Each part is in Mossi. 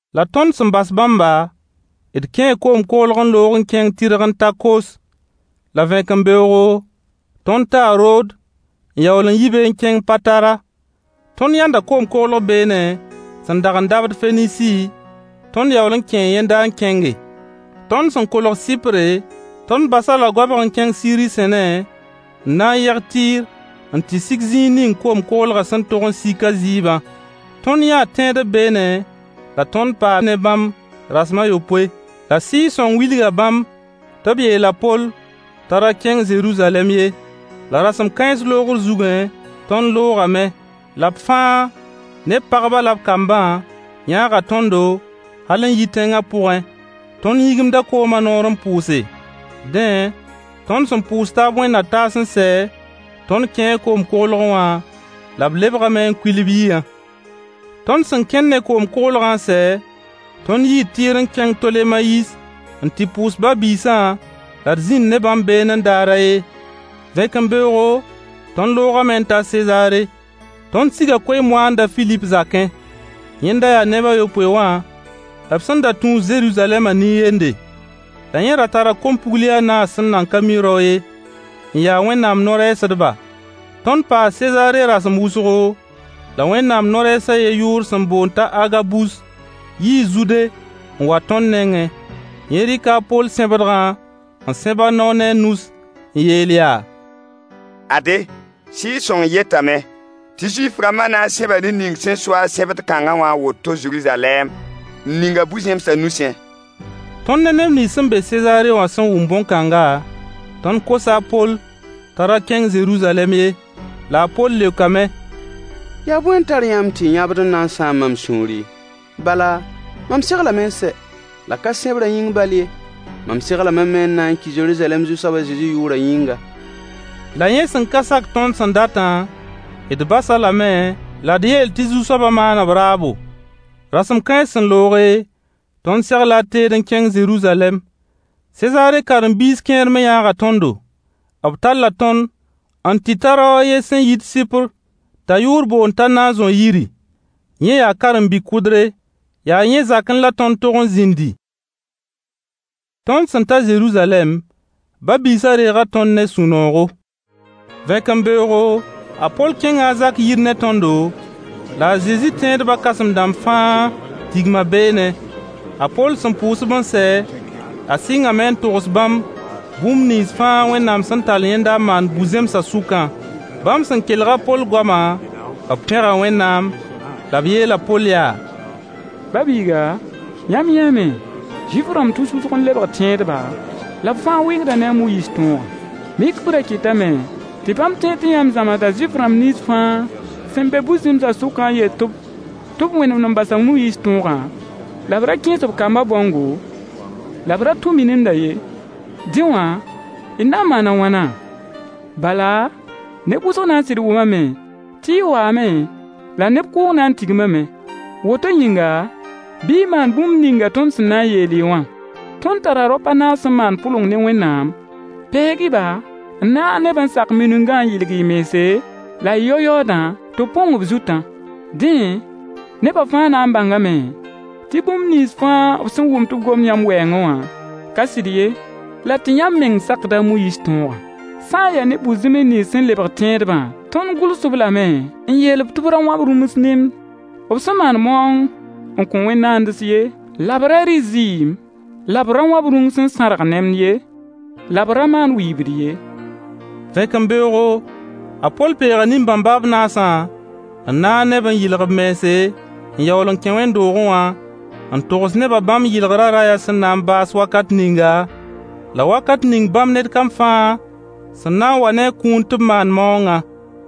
La tõnd sẽn bas bãmba, d kẽe koom-koglg n loog n kẽng tɩrg n ta Kos. La vẽkembeoogo tõnd taa Rood, n yaool n yi be n kẽng Patara. Tõnd yãnda koom-koglg beene sẽn dag n dabd Fenisi, tõnd yaool n kẽe yẽnda n kẽnge. Tõnd sẽn kẽng n kolg Sɩpre, tõnd bas-a-la goabg n kẽng Siiri sẽne n na yeg Tɩɩr n tɩ sig zĩig ning koom-koglgã sẽn tog n sik a zɩɩbã. Tõnd yãa tẽedb beene la tõnd paa ne bãmb rasem a yopoe. La Sɩɩg-sõng wilga bãmb tɩ b yeel a Poll t'a ra kẽng Zeruzalɛm ye. La rasem kãens loogr zugẽ, tõnd loogame. La b fãa ne b pagbã la b kambã yãaga tõndo, hal n yi tẽnga pʋgẽ. Tõnd yĩgimda koomã noor n pʋʋse. Dẽ, tõnd sẽn pʋʋs taab wẽnd-na-taas n sɛ, tõnd kẽe koom-koglgẽ wã, la b lebgame n kuil b yiyã. Tõnd sẽn kẽn ne koom-koglgã n sɛ, tõnd yii Tɩɩr n kẽng Tolemayis n tɩ pʋʋs ba-biisã la d zĩnd ne bãmb beene daar a yen. Vẽkembeoogo, tõnd loogame n ta Sezaare. Tõnd siga koe-moaand a Filip zakẽ. Yẽnda yaa neb a yopoe wã b sẽn da tũus Zeruzalɛmã nin-yende. La yẽ ra tara kom-pugli a naas sẽn nan ka mi rao ye, n ya Wẽnnaam no-rɛɛsdba. Tõnd paa Sezaare rasem wʋsgo, la Wẽnnaam no-rɛɛs a yen yʋʋr sẽn boond t'a Agabus yii Zude n wa tõnd nengẽ. Yẽ rɩka a Poll sẽbdgã n sẽb a nao ne a nus n yeel yaa: Ade, Sɩɩg-sõng yetame tɩ Zuif-rãmbã na n sẽba ned ning sẽn so-a sẽbd kãnga wã a woto Zeruzalɛm, n ning-a bu-zẽmsa nusẽ. Tõnd ne neb nins sẽn be Sezaare wã sẽn wʋm bõn-kãnga, tõnd kosa a Poll t'a ra kẽng Zeruzalɛm ye. La a Poll leokame: yaa bõe n tar yãmb tɩ y yãbd n na n sãam mam sũuri? Bala, mam seglame n sɛ, la ka sẽbrã yĩng bal ye. M seglame me n na n ki Zeruzalɛm Zu-soab a Zezi yʋʋrã yĩnga. La yẽ sẽn ka sak tõnd sẽn datã, d bas-a lame la d yeel tɩ Zu-soabã maan b raabo. Rasem kãens sẽn looge, tõnd segla d teed n kẽng Zeruzalɛm. Sezaare karen-biis kẽer me yãaga tõndo. B talla tõnd n tɩ ta rao a yen sẽn yit Sɩpr t'a yʋʋr boond t'a Nazõ yiri. Yẽ yaa karen-bi-kʋdre. Yaa yẽ zakẽ la tõnd tog n zĩndi. Tõnd sẽn ta Zeruzalɛm, ba-biisã reega tõnd ne sũ-noogo. Vẽkembeoogo, a Poll kẽnga a Zak yir ne tõndo, la a Zezi tẽedba kãsem-dãmb fãa tigma beene. A Poll sẽn pʋʋs-b n sɛ, a sɩngame n togs bãmb bũmb nins fãa Wẽnnaam sẽn tall yẽnda n maan bu-zẽmsã sʋkã. Bãmb sẽn kelg a Poll goama, b pẽga Wẽnnaam la b yeel a Poll yaa: Ba biiga, yãmb yãame, Zuif-rãmb tus wʋsg n lebg tẽedba, la b fãa wɩngda ne a Moyiis tõogã. Mik b ra kɩtame tɩ bãmb tẽed tɩ yãmb zãmsda Zuif-rãmb nins fãa sẽn be bu-zẽmsa sʋkã n yet-b tɩ b wẽnemd n bas a Moyiis tõogã, la b ra kẽes b kamba bãongo, la b ra tũ mininda ye. Dẽ wã, d na n maana wãna? Bala, neb wʋsg na n sɩd wʋmame tɩ y waame [la neb kʋʋng na n tigmame.] Woto yĩnga, bɩ y maan bũmb ninga tõnd sẽn na n yeel-y wã. Tõnd tara raop a naas sẽn maan pʋleng ne Wẽnnaam. Peeg-y-ba, n naag ne-b n sak miningã n yɩlg-y mense, la y yao yaoodã, tɩ b põng b zutã. Dẽ neba fãa na n bãngame tɩ bũmb nins fãa b sẽn wʋm tɩ b gomd yãmb wɛɛngẽ wã ka sɩd ye, la tɩ yãmb meng sakda a Moyiis tõogã. Sã n ya ne bu-zẽms nins sẽn lebg tẽedbã, tõnd gʋls-b lame n yeel-b tɩ b ra wãb rũms nemd b sẽn maan maoong n kõ wẽn-naands ye, la b ra rɩ zɩɩm, la b ra wãb rũng sẽn sãrg nemd ye, la b ra maan wɩɩbd ye. Vẽkembeoogo, a Poll peega nin-bãmba b naasã n naag ne-b n yɩlg-b mense, n yaool n kẽ wẽnd-doogẽ wã n togs nebã bãmb yɩlgrã rayã sẽn na n baas wakat ninga, la wakat ning bãmb ned kam fãa sẽn na n wa ne a kũun tɩ b maan maoongã.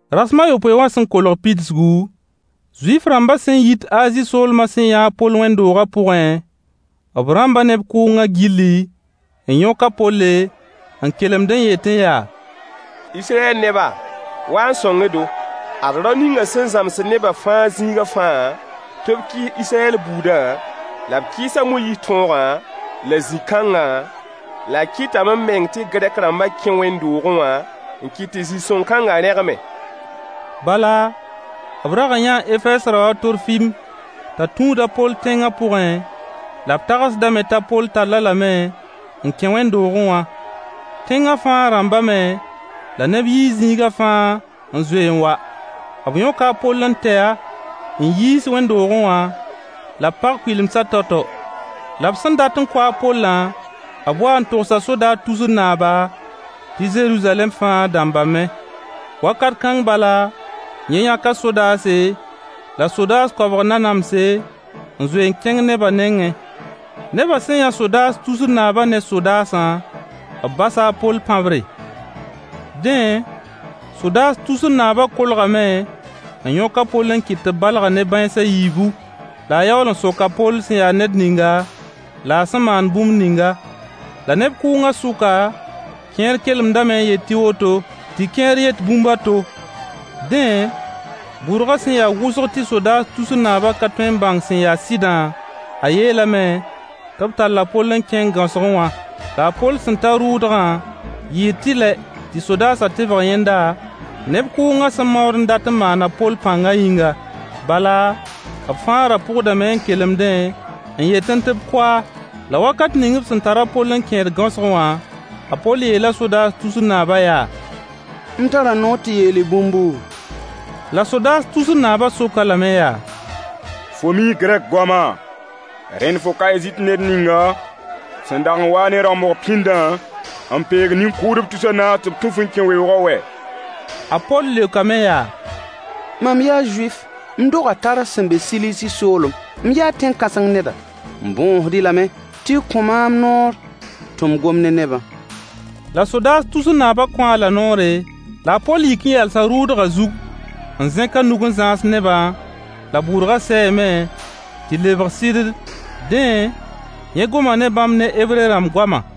Rasem a yopoe wã sẽn kolg pidsgu, Zuif-rãmbã sẽn yit Azi soolmã sẽn yãa a Poll wẽnd-doogã pʋgẽ, b rãmba neb kʋʋngã gilli, n yõk a Polle, n kelemd n yetẽ yaa: Israyɛl neba, wa n sõng-y-do! Ad rao ninga sẽn zãmsd neba fãa zĩiga fãa tɩ b kɩɩs Israyɛl buudã, la b kɩɩs a Moyiis tõogã la zĩ-kãnga, la a kɩtame meng tɩ Gɛrk-rãmb kẽ wẽnd-doogẽ wã n kɩt tɩ zĩ-sõng-kãnga rẽgme. Bala b rag n yãa Efɛɛs rao a Torfim t'a tũud a Poll tẽngã pʋgẽ, la b tagsdame t'a Poll tall-a lame n kẽ wẽnd-doogẽ wã. Tẽngã fãa rãmbame, la neb yii zĩiga fãa n zoe n wa. B yõka a Poll n tɛ-a n yiis wẽnd-doogẽ wã, la b pag kuɩlemsã tao-tao. La b sẽn dat kʋ a Pollã, b wa n togsa sodaas tusr naaba tɩ Zeruzalɛm fãa dãmbame. Wakat kãng bala, yẽ yãka sodaase, la sodaas koabg nanamse, n zoe n kẽng neba nengẽ. Nebã sẽn yã sodaas tusr naaba ne sodaasã, b basa a Poll pãbre. Dẽ, sodaas tusr naaba kolgame n yõka a Poll n kɩt tɩ b balg-a ne bãens a yiibu. La a yaool n sok a Poll sẽn ya ned ninga, la a sẽn maan bũmb ninga. La neb kʋʋngã sʋka, kẽer kelemdame n yet tɩ woto, tɩ kẽer yet bũmb a to. Dẽ, bʋrgã sẽn ya wʋsg tɩ sodaas tusr naabã ka tõe n bãng sẽn ya sɩdã, a yeelame tɩ b tall a Poll n kẽng gãosgẽ wã. La a Poll sẽn ta rʋʋdgã, yɩɩ tɩlɛ tɩ sodaasã tebg yẽnda, neb kʋʋngã sẽn maood n dat n maan a Poll pãnga yĩnga. Bala, b fãa ra pʋgdame n kelemdẽ n yetẽ tɩ b kʋ-a. La wakat ning b sẽn tar a Poll n kẽed gãosgẽ wã, a Poll yeela sodaas tusr naabã yaa: M tara noor tɩ yeel-y bũmbu? La sodaas tusr naabã sok-a lame yaa: Fo mii Gɛrk goamã? Rẽnd fo ka Ezipt ned ninga sẽn dag n wa-a ne rãmbg pĩndã, n peeg nin-kʋʋdb tus a naas tɩ b tũ-f n kẽ weoogã wɛ? A Poll leokame yaa: Mam yaa Zuif, m doga Tars sẽn be Silisi soolem, m yaa tẽn-kãseng neda. M bõosd-y lame tɩ y kõ-maam noor tɩ m gom ne nebã. La sodaas tusr naabã kõ-a-la noore, la a Poll yik n yalsa rʋʋdgã zug n zẽk a nug n zãas neba, la bʋrga sɛɛme, tɩ lebg sɩddd. Dẽ, yẽ gomã ne bãmb ne Hebre rãmb goamã.